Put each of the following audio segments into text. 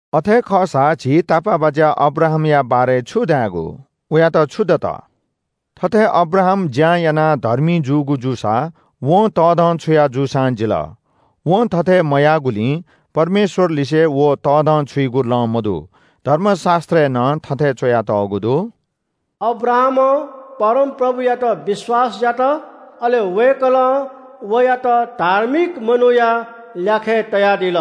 अथे खःसा झी तापाःबाज्‍या अब्राहामया बारे छु धायेगु? वयात छु दत? थथे अब्राहाम ज्‍यां यानाः धर्मी जूगु जूसा वं तःधंछुया जूसां जिल। वं थथे मयाःगुलिं परमेश्‍वरलिसे व तःधंछुइगु लँ मदु। धर्मशास्‍त्रय् नं थथे च्‍वयातःगु दु – “अब्राहामं परमप्रभुयात विश्‍वास यात। अले वय्‌कलं वयात धार्मिक मनूया ल्‍याखय् तयादिल।”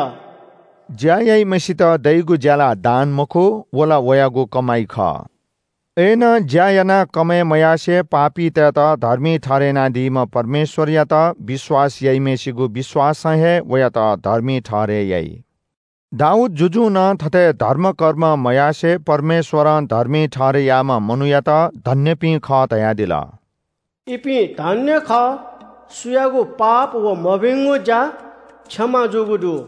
ज्‍या याइम्‍हय्‌सित दइगु ज्‍याला दान मखु, व ला वयागु कमाइ खः। अय्‌नं ज्‍या यानाः कमय् मयासें पापीतय्‌त धर्मी ठहरय् यानादीम्‍ह परमेश्‍वरयात विश्‍वास याइम्‍हय्‌सिगु विश्‍वासं हे वयात धर्मी ठहरय् याइ। दाऊद जुजुं नं थथे धर्मकर्म मयासें परमेश्‍वरं धर्मी ठहरय् याःम्‍ह मनूयात धन्‍यपिं खः धयादिल – “इपिं धन्‍य खः, सुयागु पाप व मभिंगु ज्‍या क्षमा जूगु दु।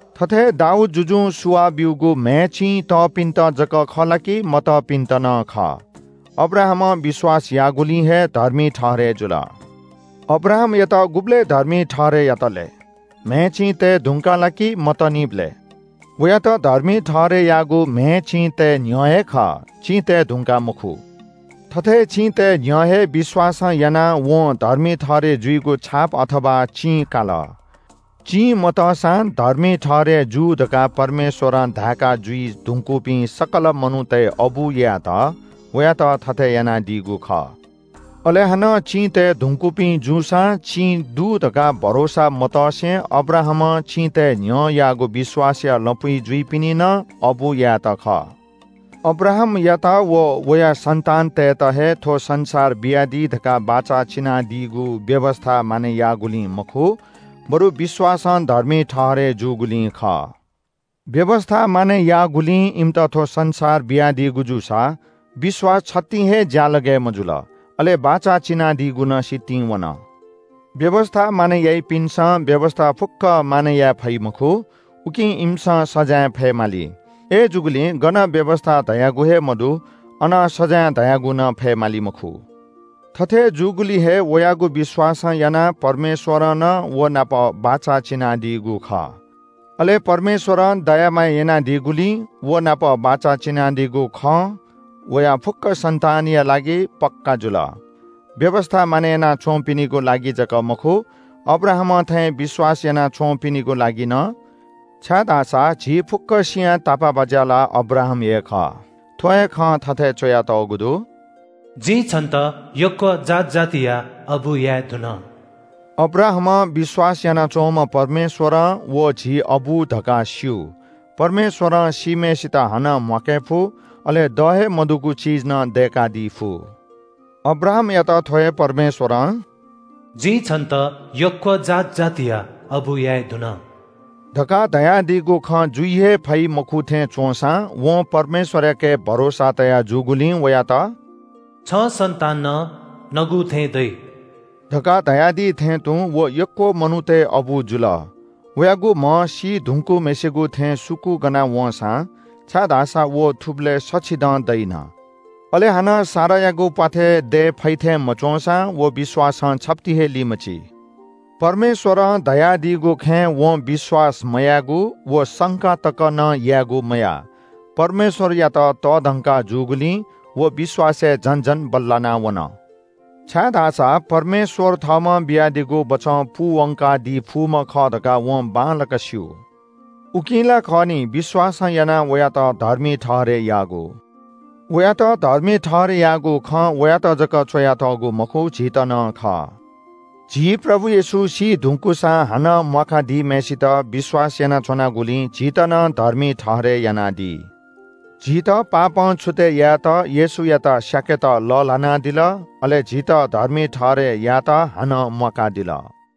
थथे दाऊद जुजुं सुवाः ब्‍यूगु म्‍हय् चिं तःपिन्‍त जक खः ला कि मतःपिन्‍त नं खः? अब्राहामं विश्‍वास याःगुलिं हे धर्मी ठहरय् जुल। अब्राहामयात गुबलय् धर्मी ठहरय् यात लय्? म्‍हय् चिं तये धुंकाः ला कि मतःनिबलय्? वयात धर्मी ठहरय् याःगु म्‍हय् चिं तये न्‍ह्यः हे खः, चिं तये धुंकाः मखु। थथे चिं तये न्‍ह्यः हे विश्‍वासं यानाः वं धर्मी ठहरय् जुइगु छाप अथवा चिं काल। चिं मतःसां धर्मी ठहरय् जू धकाः परमेश्‍वरं धायेका जुइ धुंकूपिं सकल मनूतय् अबु यायेत वयात थथे यानादीगु खः। अले हानं चिं तये धुंकूपिं जूसां चिं दु धकाः भरोसा मतसे अब्राहामं चिं तये न्‍ह्यः याःगु विश्‍वासया लँपुइ जुइपिनि नं अबु यायेत खः। अब्राहामयात व वया सन्‍तानतय्‌त हे थ्‍व संसार बियादी धकाः बाचा चिनादीगु व्‍यवस्‍था मानय् याःगुलिं मखु बरु विश्‍वासं धर्मी ठहरय् जूगुलिं खः। व्‍यवस्‍था मानय् याःगुलिं इमित थ्‍व संसार बियादीगु जूसा विश्‍वास छतिं हे ज्‍यालगय् मजुल, अले बाचा चिनादीगु नं सितिं वन। व्‍यवस्‍था मानय् याइपिन्‍सं व्‍यवस्‍था फुक्‍कं मानय् याये फइ मखु, उकिं इमिसं सजाँय फयेमाली। अय्‌जूगुलिं गन व्‍यवस्‍था धयागु हे मदु, अन सजाँय धयागु नं फयेमाली मखु। थथे जूगुलिं हे वयागु विश्‍वासं यानाः परमेश्‍वरं नं व नाप बाचा चिनादीगु खः। अले परमेश्‍वरं दया माया यानादीगुलिं व नाप बाचा चिनादीगु खँ वया फुक्‍क सन्‍तानया लागि पक्‍का जुल। व्‍यवस्‍था मानय् याना च्‍वंपिनिगु लागि जक मखु, अब्राहामं थें विश्‍वास याना च्‍वंपिनिगु लागि नं, छाय्‌धाःसा झी फुक्‍कसियां तापाःबाज्‍या ला अब्राहाम हे खः। थ्‍व हे खँ थथे च्‍वयातःगु दु – “जिं छन्‍त यक्‍व जात जातिया अबु याये धुन।” अब्राहामं विश्‍वास यानाच्‍वंम्‍ह परमेश्‍वरं व झी अबु धकाः स्‍यू। परमेश्‍वरं सीम्‍हय्‌सित हानं म्‍वाके फु, अले द हे मदुगु चिज नं दय्‌कादी फु। अब्राहामयात थ्‍व हे परमेश्‍वरं – “जिं छन्‍त यक्‍व जात जातिया अबु याये धुन” धकाः धयादीगु खँ जुइ हे फइ मखु थें च्‍वंसां वं परमेश्‍वरयाके भरोसा तया जूगुलिं वयात “छं सन्‍तान नं नगु थें दइ” धकाः धयादी थें तुं व यक्‍व मनूतय् अबु जुल। वयागु म्‍ह सी धुंकूम्‍हय्‌सिगु थें सुकूगना वंसां, छाय्‌धाःसा व थुबलय् सछि दँ दइन, अले हानं सारायागु प्‍वाथय् दये फइ थें मच्‍वंसां व विश्‍वासं छप्‍ति हे लिमची। परमेश्‍वरं धयादीगु खँय् वं विश्‍वास मयायेगु व संका तक नं यायेगु मयाः। परमेश्‍वरयात तःधंका जूगुलिं व विश्‍वासय् झन झन बल्‍लानावन। छाय्‌धाःसा परमेश्‍वर थःम्‍हं बियादीगु बचं पूवंकादी फुम्‍ह खः धकाः वं बांलाक स्‍यू। उकिं ला खः नि, विश्‍वासं यानाः वयात धर्मी ठहरय् याःगु। वयात धर्मी ठहरय् याःगु खँ वयात जक च्‍वयातःगु मखु, झीत नं खः। झी प्रभु येशू सी धुंकूसां हानं म्‍वाका दीम्‍हय्‌सित विश्‍वास यानाच्‍वनागुलिं झीत नं धर्मी ठहरय् यानादी। झीत पापं छुतय् यायेत येशूयात स्‍याकेत लःल्‍हानादिल, अले झीत धर्मी ठहरय् यायेत हानं म्‍वाकादिल।